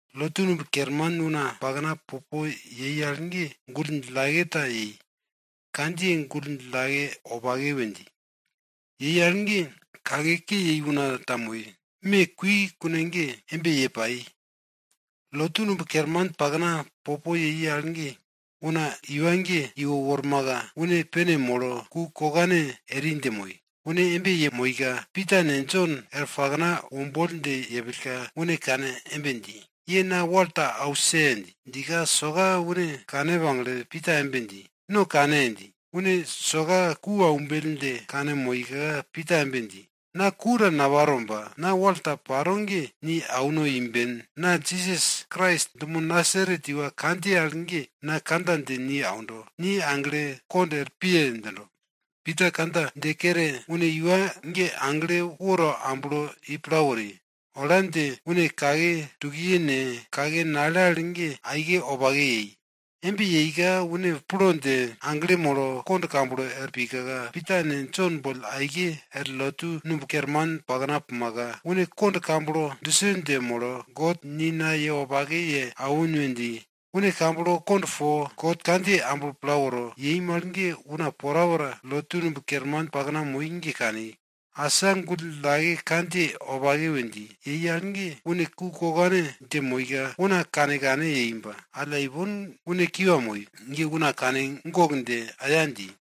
Lotu numb kerman una pakna popo yei al ge gull djillake ta yei, kandjiye gull djillake wopake we dji. Yei al ge, kake ke yei una ta moi. Me kui kune ge embe ye pai. Lotu numb kerman pakna popo yei al ge, una iwa ge iwo wormaka, une pene molo ku kokane eri dje moi. Une embe yemoika, Pita ne Jon er pakna womboll dje yepillka, une kane embe dji, ye na wal ta ause! dji. Djika soka une kane pagle Pita embe dji, no kane! dji. Une soka ku aumbell dje kanmoika, Pita embe dji, na ku ta naparo ba, na wal ta paro ge ni auno imben. Na Jisas Krais dumo Nasaret iwa kandjiye al ge na kandja dje ni aundo, ni aglo, kond er piye! djindo. Pita kandja dje kere une iwa ge agle woto amblo i pla wori. Ola dje une kake tukiye ne, kake nale al ge aike wopake yei. Embe yeika une plo dje, aglo molo kond kamblo er pika, Pita ne Jon boll aike er lotu numb kerman pakna pumaka, une kond kamblo duse dje molo, God ni na ye wopake ye awin we dji. Une kamblo kond po God kandjiye amblo pla woro yei mal ge, una porapora lotu numb kerman pakna moi ge kani. Asa gull djillake kandjiye wopake we dji yei al ge, une ku kokane dje moika, una kane kane yei ba, alla ipon une kiwa moi ge una kane gok dje, aya dji.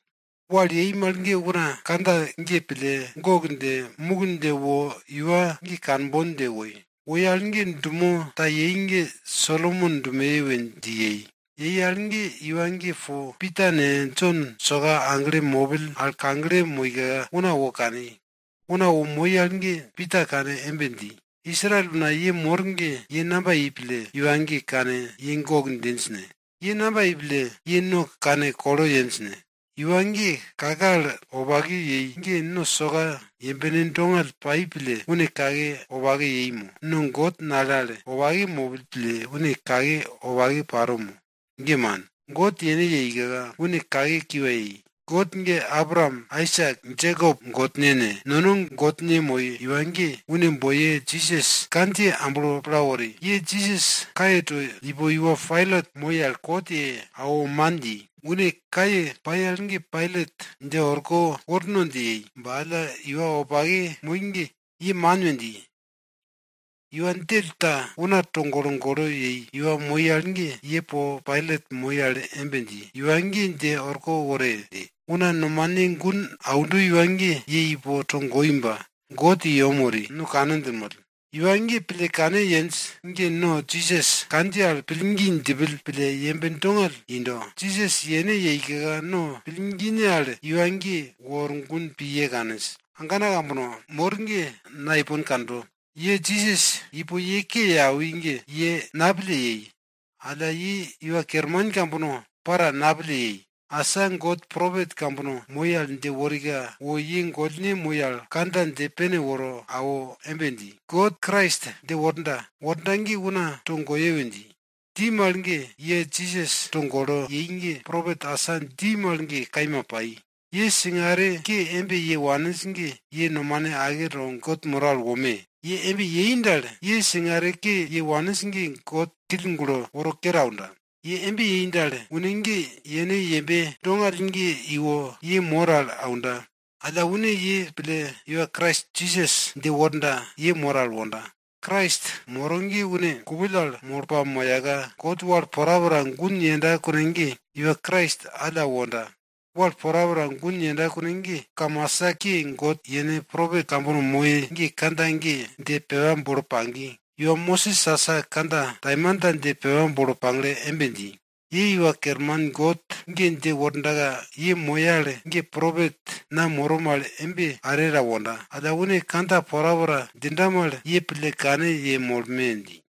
Wal yei mal ge una kandja ge pille, gok dje muk dje wo iwa ge kanbon dje woi. Woi al ge dumo ta yei ge Solomon dumoye yei we dji. Yei al ge, iwa ge po Pita ne, Jon soka aglo mopill al kagle moika, una wo kani. Una wo moi al ge Pita kane embe dji, Israel una ye mor ge, ye namba yei pille iwa ge kane gok djinj ne? Ye namba yei pille no kane kolo yenj ne? Iwa ge kake al wopake yei ge no soka yembene dongall pai pille une kake wopake yei mo? No God nale al wopake mopill pille une kake wopake paro mo? Ge man! God yene yeika, une kake kiwa yei. God ge Abraam, Aisak, Jekop Godne ne, no gollne Godne moi iwa ge, une boiye Jisas kandjiye amblo pla wori. Ye Jisas kaye to ipo iwa Pailat moi al kot ye awo man dji. Une kaye pai al ge Pailat dje orko worno dje yei ba alla, iwa wopake kaima moi ge, ye man we dji, iwa djell ta una togolo golo yei iwa moi al ge, ye po Pailat moi al embe dji, iwa ge dje orko wore! dji. Una nomane gun aundo iwa ge ye ipo togoi ba, God i yem wori, no kane djinmoll. Iwa ye pille kane yenj ge no Jisas kandjiye al pillgi djipill pille yembe dongall indo. Jisas yene yeika no pillgine al iwa ge wor gun pi ye kaninj. Agana kambono mor ge na ipon kando. Ye Jisas ipo ye ke ye awi ge, ye napille yei, alla ye iwa kerman kambono para napille yei. Asa God propet kambono moi al dje worika, wo ye gollne moi al kandja dje pene woro awo embe dji, God Krais dje worda, wonda ge una togoye we dji. Dji mal ge, ye Jisas togolo yei ge, propet asa dji mal ge kaima pai. Ye singare ke embe ye waninj ge ye nomane ake to God moro al wome! Ye embe yei dal, ye singare ke ye waninj ge God kill gulo woro kere aunda. Ye embe yei dal, une ge yene yembe dongall ge iwo ye mor al aunda, alla une ye pille, iwa Krais Jisas dje worda, ye mor al wonda. Krais moro ge une kupill al molo pamoyaka, God wal porapora gun yenda kune ge, iwa Krais alla wonda. Wal porapora gun yenda kune ge, kamasa ke God yene propet kambono moi ge kandja ge dje pepa bolo pagi. Iwa Mosis asa kandja taimanta dje pepa bolo pagle embe dji, Ye Iwa Kerman God ge dje wordaka ye moye al ge propet na moro mal embe are ta wonda. Alla une kandja porapora djinda mal, ye pille kane yemolme! dji.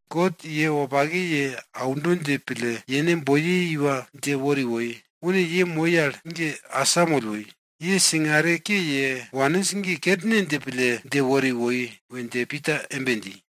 God ye wopake ye auno dje pille, yene boiye iwa dje wori woi. Une ye moi al ge asamoll woi. Ye singare ke ye waninj ge kerne dje pille dje wori woi we dje Pita embe dji.